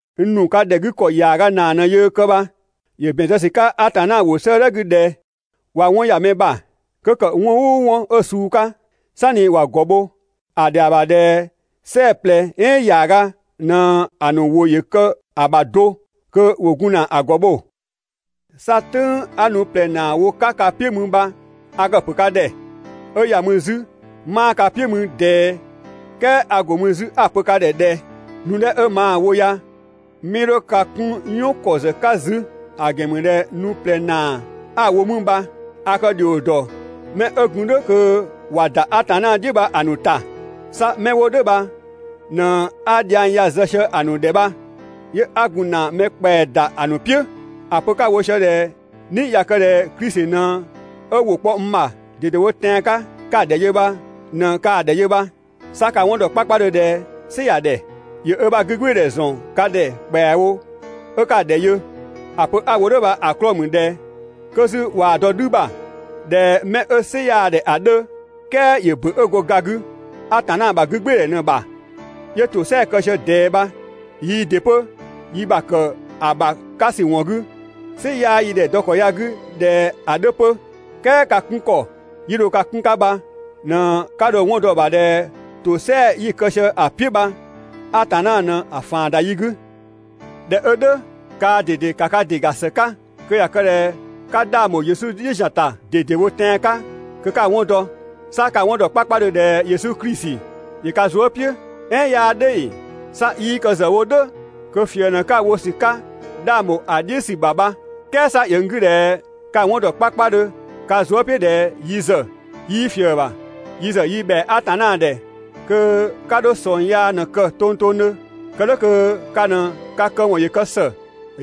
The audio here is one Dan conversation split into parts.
N ‑nu ka ‑dhɛ 'gü ‑kɔ ‑yaaga ‑naa ꞊në yöö kë bha. ‑Yö ‑bɛn zë ‑sü 'ka Atanna ‑wʋ 'sëëdhɛ 'gü ꞊dhɛ: «꞊Wa 'wɔn ‑ya mɛ ‑bha, 'kö ‑kë 'wɔn "ʋʋ 'wɔn 'ö‑ suu 'ka, "sanni ‑wa ‑gɔ bho, ‑a ‑dhɛa ‑bha ꞊dhɛ "sɛɛ‑ ꞊plɛ "ɛɛn ‑yaaga ꞊në‑ ‑nu ‑wʋ ‑yö kë‑ ‑bha do kö ‑wo gun ‑na ‑a ‑gɔ bho.» 'Sa "tʋ̈ng 'a nu ꞊plɛ ‑naa wo‑ 'ka ka "piʋ̈ mü bha, a kë‑ ‑pö ka ‑dhɛ, 'ö ‑ya mü 'zü 'maa ka "piʋ̈ mü ꞊dɛɛ "kɛɛ a ‑go mü 'zü 'a‑ pö ka ‑dhɛ ꞊dhɛ: Nu 'dhɛ 'ö maa‑ wo ya 'mii 'dho ka 'kun "yɔn ‑kɔ ‑zë 'ka 'zü, ‑a ‑gɛn ‑mü ꞊dhɛ nu ꞊plɛ ‑naa 'a‑ wo mü bha a kë ‑dhio ‑dɔ 'mɛ 'ö gun "dhʋ̈ kö ꞊wa ‑da Atanna "dhiʋ̈ bha‑ ‑nu ‑ta, 'sa 'mɛ 'wo "dhʋ̈ bha ꞊në 'a dhiang ya‑ zë sië‑ ‑nu ‑dhɛ bha, 'yö 'a gun ‑na mɛ ‑kpɛa ‑da ‑a ‑nu "piʋ̈. ‑A pö 'ka‑ wo ꞊siö ꞊dhɛ "ni ꞊ya kë ꞊dhɛ Klisi ꞊në ö ‑wʋ kpɔ n ‑bha ꞊dedewo tɛan‑ 'ka 'ka‑ ‑dhɛ yö bha ꞊në kaa‑ ‑dhɛ yö bha. 'Sa ka‑ 'wɔn ‑dɔ 'kpakpadhö ꞊dhɛ "sɩ ‑ya ‑dhɛ. ‑Yö ö ‑bha 'gügbɩɩdhɛ ‑zɔn ka ‑dhɛ ‑kpɛawo 'ö 'ka‑ ‑dhɛ yö. ‑A pö 'a‑ wo "dhʋ̈ bha‑ 'klɔɔ‑ ‑mü ꞊dhɛ 'kö 'zü ꞊waa‑ dɔ "dhü ‑bha ꞊dhɛ 'mɛ 'ö "sɩ 'yaa‑ ‑dhɛ ‑a 'dhö, "kɛɛ ‑yö ‑bö 'ö go ga 'gü Atanna ‑bha 'gügbɩɩdhɛ ꞊në‑ ‑bha, 'yö ‑tosɛa kë sië ꞊dɛɛ bha. Yii ‑dɩ 'pö yi ‑bha ‑kë ‑a ‑bha 'ka ‑sü ‑wɔn 'gü, "sɩ 'yaa yi ‑dhɛ dɔ ‑kɔ ya‑ 'gü ꞊dhɛ ‑a 'dhö 'pö, "kɛɛ ka 'kun ‑kɔ 'yi dho ka 'kun‑ 'ka bha ꞊në 'ka dho‑ 'wɔn dɔ‑ ‑bha ꞊dhɛ ‑tosɛa 'yi‑ kë sië ‑a "piʋ̈ bha Atanna ꞊në‑ ‑faan ‑da yi 'gü. ꞊Dhɛ 'ö "dhʋ̈, kaa ꞊dede ‑ka ka ‑dɩ ‑ga ‑së 'ka kö ꞊ya kë ꞊dhɛ 'ka 'dhang ‑bho Yesu "dhiʋ̈ ‑zian ‑ta ꞊dedewo tɛan‑ 'ka kö 'ka‑ 'wɔn dɔ. 'Sa ka‑ 'wɔn ‑dɔ 'kpakpadhö ꞊dhɛ Yesu Klisi ‑yö ka zuë" "piʋ̈, "ɛɛn 'yaa "dhʋ̈ ‑ee? 'Sa 'yii kë ‑zë wo "dhʋ̈ kö ꞊fië ꞊në 'ka‑ wo ‑sü 'ka 'dhang bho ‑a "dhiʋ̈ ‑sü ‑bha bha. "Kɛɛ 'sa ‑yö n 'gü ꞊dhɛ ka‑ 'wɔn ‑dɔ 'kpakpadhö ka zuë" "piʋ̈ ꞊dhɛ yi ‑zë 'yii ꞊fië‑ ‑bha. Yi ‑zë yi ‑bhɛa Atanna ‑dhɛ kö 'ka 'dho 'sɔngyaa ꞊në‑ kë tongtongdhö, kë "dhʋ̈ kö ka ꞊në ka këwɔn ‑yö kë ‑së,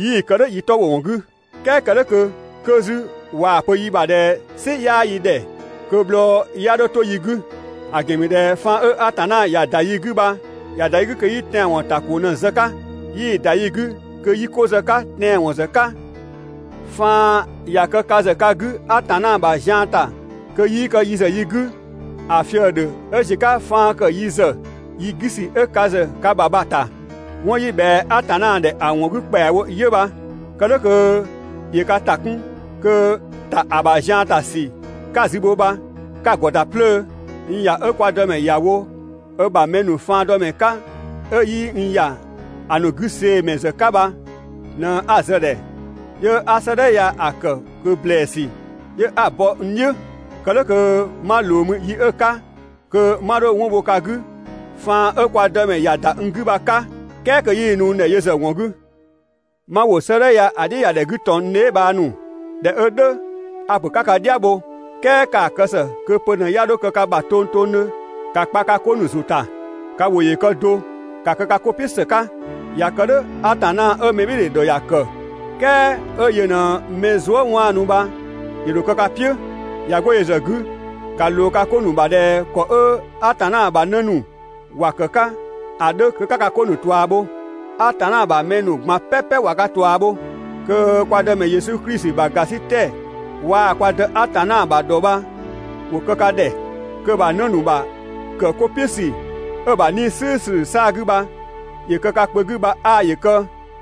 'yii‑ kë "dhʋ̈ yi 'tɔ ‑wo ‑wɔn 'gü. "Kɛɛ kë "dhʋ̈ kö 'kö 'zü ꞊waa‑ pö yi ‑bha ꞊dhɛ "sɩ 'yaa yi ‑dhɛ, kö‑ bhlɔ 'ya 'dho 'to yi 'gü. ‑A ‑gɛn ‑mü ꞊dhɛ faan 'ö Atanna ‑ya ‑da yi 'gü bha ‑ya ‑da yi 'gü kö 'yi tɛanwɔn ‑ta ‑ko ꞊në‑ zë‑ 'ka, yii‑ ‑da yi 'gü kö 'yi 'ko zë‑ 'ka tɛanwɔn ‑zë 'ka. Faan ꞊ya kë ka ‑zë ka 'gü Atanna ‑bha zian ‑ta kö 'yii kë yi ‑zë yi 'gü, ‑a fië‑ ‑dhö 'ö ‑ziö 'ka faan ‑kë yi ‑zë yi 'gü ‑sü 'ö ka ‑zë ka ‑bha bha‑ ‑bha. 'Wɔn 'yi ꞊bhɛa Atanna ‑dhɛ ‑a ‑wɔn 'gü ‑kpɛawo 'yö bha, kë "dhʋ̈ kö ‑yö ka ‑ta 'kun kö ‑ta ‑a ‑bha zian ‑ta ‑sü 'ka‑ zü bho bha 'ka‑ ‑gɔ ‑da 'plöö. N ‑ya 'ö Atanna ‑ya wo ö ‑bha mɛ ‑nu faandɔmɛ 'ka 'ö 'yii n ‑ya ‑a ‑nu 'gü see‑ ‑mɛ ‑zë 'ka bha ꞊në 'a zë‑ ‑dhɛ, 'yö 'a 'sëëdhɛ ya‑ ‑kë ꞊kö ‑blɛɛsü 'yö 'a‑ bɔ n "dhiʋ̈, kë "dhʋ̈ kö 'ma ꞊loo mü yi 'ö‑ 'ka, kö 'ma 'dho 'wɔn bho ka 'gü faan 'ö Atanna ‑ya ‑da n 'gü bha‑ 'ka, "kɛɛ kö 'yii‑ nu n ‑dhɛ yö ‑zë ‑wɔn 'gü. 'Ma ‑wo 'sëëdhɛ ya‑ "dhiʋ̈ ‑ya ‑dhɛ 'gü ꞊tɔn n dheebhang ‑nu! ꞊Dhɛ 'ö "dhʋ̈, a‑ pö 'ka ka "dhia bho, "kɛɛ ‑kaa kë ‑së kö pö ꞊në 'ya 'dho kë ka ‑bha tongtongdhö, ‑ka kpa ka 'ko ‑nu ‑zʋ ‑gɔn, ka ‑wʋ ‑yö kë do, ‑ka kë ka 'ko "piʋ̈ ‑së 'ka, ꞊ya kë "dhʋ̈, Atanna 'ö mɛbhɩɩdhe ‑dhɔ ‑ya ‑kë, "kɛɛ 'ö yö ꞊në mɛ zuë" 'waanu bha ‑yö ‑dho kë ka "piʋ̈. ꞊Ya 'go yö ‑zë 'gü, ‑ka ꞊loo ka 'ko ‑nu ‑bha ꞊dhɛ ‑kɔ 'ö Atanna ‑bha 'në ‑nu ‑wa ‑kë 'ka ‑a 'dhö kö 'ka ka 'ko ‑nu ꞊tua bho. Atanna ‑bha mɛ ‑nu ꞊gban "pɛpɛ ꞊wa ka ꞊tua bho. Kö kwa Dëmɛ Yesu Klisi ‑bha ‑gasitɛ waa‑ kwa (Dë) Atanna ‑bha ‑dhɔ bha ‑wo kë ka ‑dhɛ. Kö‑ ‑bha 'në ‑nu ‑bha ‑kë 'ko "piʋ̈ ‑sü 'ö‑ ‑bha 'Nii‑ "slʋ̈ʋ̈slʋ̈ 'saa‑ 'gü bha ‑yö kë ka kpö 'gü bha 'aa ‑yö kë.